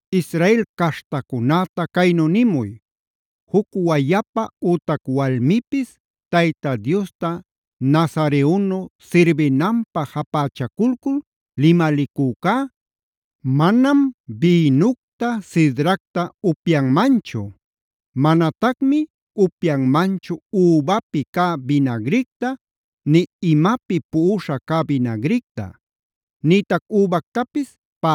“Israel caśhtacunäta caynu nimuy: ‘Juc wayapa ütac walmipis Tayta Diosta nazareonu sirbinanpä japächaculcul limalicücá, manam bïnucta, sidracta upyanmanchu. Manatacmi upyanmanchu übapïta cä binagricta, nï imapi puꞌuśha cä binagricta; nïtac übactapis,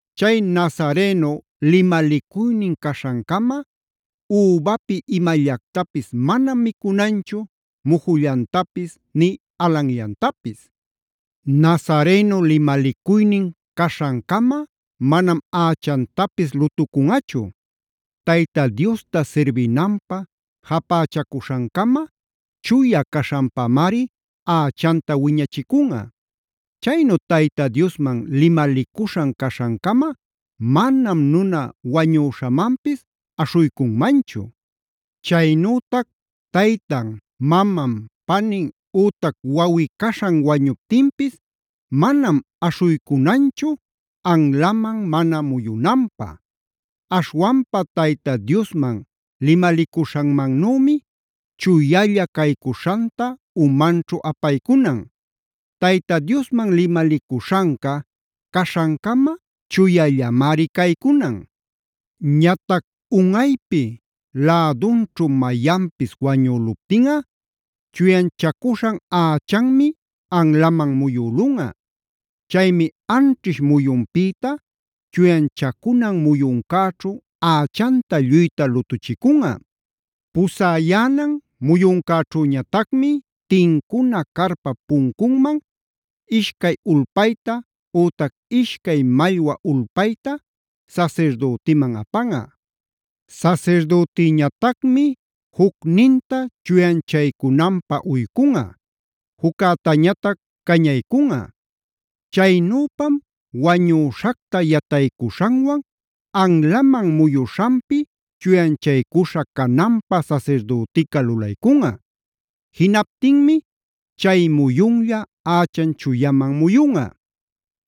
Chay nazareno limalicuynin caśhancama übapi imallactapis manam micunanchu, mujullantapis ni alanllantapis. “ ‘Nazareo limalicuynin caśhancama manam ächantapis lutucunꞌachu. Tayta Diosta sirbinanpä japächacuśhancama chuya caśhanpamari ächanta wiñachicunꞌa. Chaynu Tayta Diosman limalicuśhan caśhancama manam nuna wañüśhamanpis aśhuycunmanchu. Chaynütac taytan, maman, panin ütac wawꞌi-caśhan wañuptinpis manam aśhuycunanchu, anlaman mana muyunanpä. Aśhwanpa Tayta Diosman limalicuśhanmannümi chuyalla caycuśhanta umanćhu apaycunan. Tayta Diosman limalicuśhanca caśhancama chuyallamari caycunan. “ ‘Ñatac unꞌaypi lädunćhu mayanpis wañüluptinꞌa chuyanchacuśhan ächanmi anlaman muyülunꞌa. Chaymi anćhish muyunpïta chuyanchacunan muyuncäćhu ächanta lluyta lutuchicunꞌa. Pusäyänan muyuncäćhüñatacmi tincuna carpap puncunman ishcay ulpayta ütac ishcay mallwa ulpayta sasirdütiman apanꞌa. Sasirdütiñatacmi jucninta chuyanchacunanpä uycunꞌa, juccätañatac cañaycunꞌa. Chaynüpam wañüśhacta yataycuśhanwan anlaman muyuśhanpi chuyanchaycuśha cananpä sasirdütica lulaycunꞌa. Jinaptinmi chay muyunlla ächan chuyaman muyunꞌa.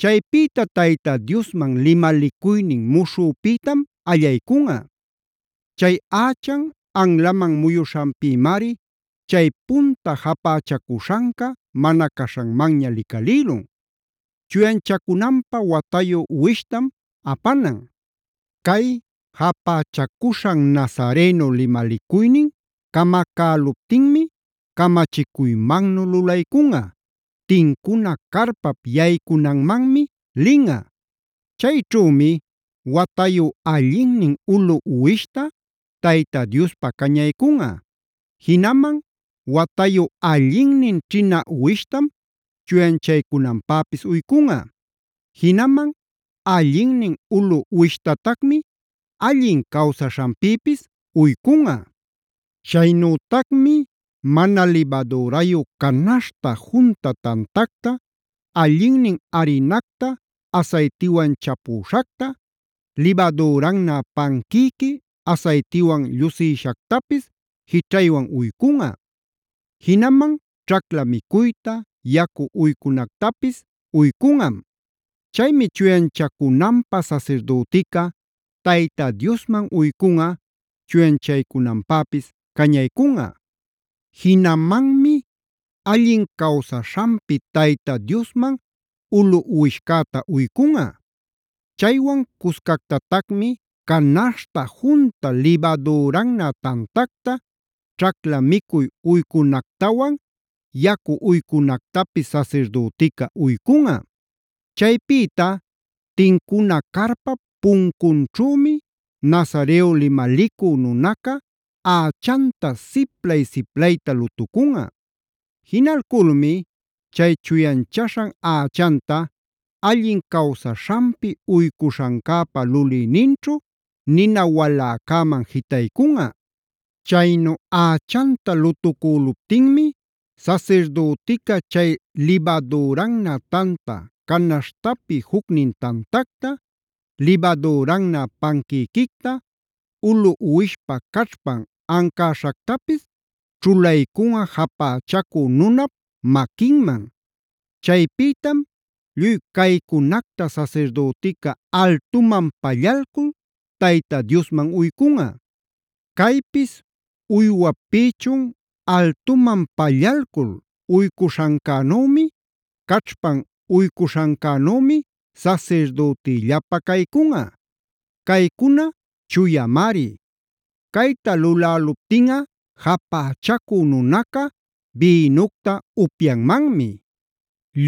Chaypïta Tayta Diosman limalicuynin muśhüpïtam allaycunꞌa. Chay ächan anlaman muyuśhanpïmari chay punta japächacuśhanca mana caśhanmanña licalïlun. Chuyanchacunanpä watayu uwishtam apanan. “ ‘Cay japächacuśhan nazareo limalicuynin camacäluptinmi camachicuymannu lulaycunꞌa: Tincuna carpap yaycunanmanmi linꞌa. Chayćhümi watayu allinnin ulu uwishta Tayta Diospä cañaycunꞌa; jinaman watayu allinnin ćhina uwishtam chuyanchacunanpäpis uycunꞌa. Jinaman allinnin ulu uwishtatacmi allin cawsaśhanpïpis uycunꞌa. Chaynütacmi mana libadürayu canaśhta junta tantacta, allinnin arinacta asaytiwan chapüśhacta, libadürannä panquïqui asaytiwan llusïshactapis jićhaywan uycunꞌa. Jinaman ćhacla micuyta, yacu uycunactapis uycunꞌam. “ ‘Chaymi chuyanchacunanpä sasirdütica Tayta Diosman uycunꞌa, chuyanchaycunanpäpis cañaycunꞌa. Jinamanmi allin cawsaśhanpi Tayta Diosman ulu uwishcäta uycunꞌa. Chaywan cuscactatacmi canaśhta junta libadürannä tantacta, ćhacla micuy uycunactawan yacu uycunactapis sasirdütica uycunꞌa. Chaypïta tincuna carpap puncunćhümi nazareo limalicu nunaca ächanta siplay-siplayta lutucunꞌa. Jinalculmi chay chuyanchaśhan ächanta allin cawsaśhanpi uycuśhancäpa lulïninchu nina waläcäman jitaycunꞌa. “ ‘Chaynu ächanta lutucüluptinmi sasirdütica chay libadürannä tanta canaśhtapi jucnin tantacta, libadürannä panquïquicta, ulu uwishpa caćhpan ancäśhactapis ćhulaycunꞌa japächacu nunap maquinman. Chaypïtam lluy caycunacta sasirdütica altuman pallalcul Tayta Diosman uycunꞌa. Caypis uywap pïchun altuman pallalcul uycuśhancänümi, caćhpan uycuśhancänümi sasirdütillapä caycunꞌa; caycuna chuyamari. Cayta luläluptinꞌa japächacü nunaca bïnucta upyanmanmi.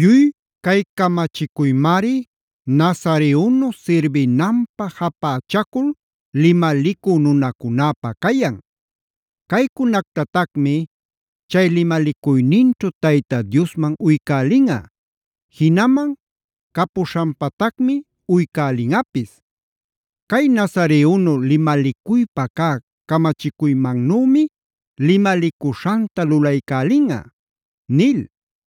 “ ‘Lluy cay camachicuymari Nazareonu sirbinanpä japächacul limalicu nunacunäpä cayan. Caycunactatacmi chay limalicuyninćhu Tayta Diosman uycälinꞌa. Jinaman capuśhanpatacmi uycälinꞌapis. Cay Nazareonu limalicuypa cä camachicuymannümi limalicuśhanta lulaycälinꞌa’”b nil.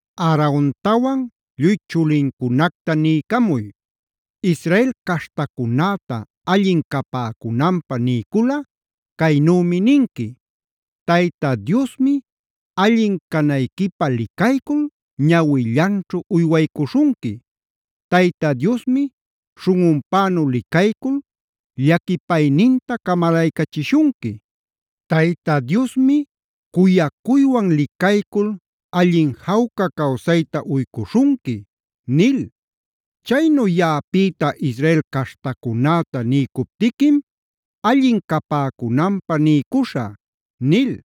“Aarontawan lluy chulincunacta niycamuy: ‘Israel caśhtacunäta allin capäcunanpä niyculꞌa caynümi ninqui: “ ‘Tayta Diosmi allin canayquipä licaycul ñawillanćhu uywaycuśhunqui. Tayta Diosmi śhunꞌunpänu licaycul llaquipayninta camalaycachishunqui. Tayta Diosmi cuyacuywan licaycul allin jawca cawsayta uycuśhunqui’ nil. “Chaynu yaꞌapïta Israel caśhtacunäta niycuptiquim allin capäcunanpä niycuśhä” nil.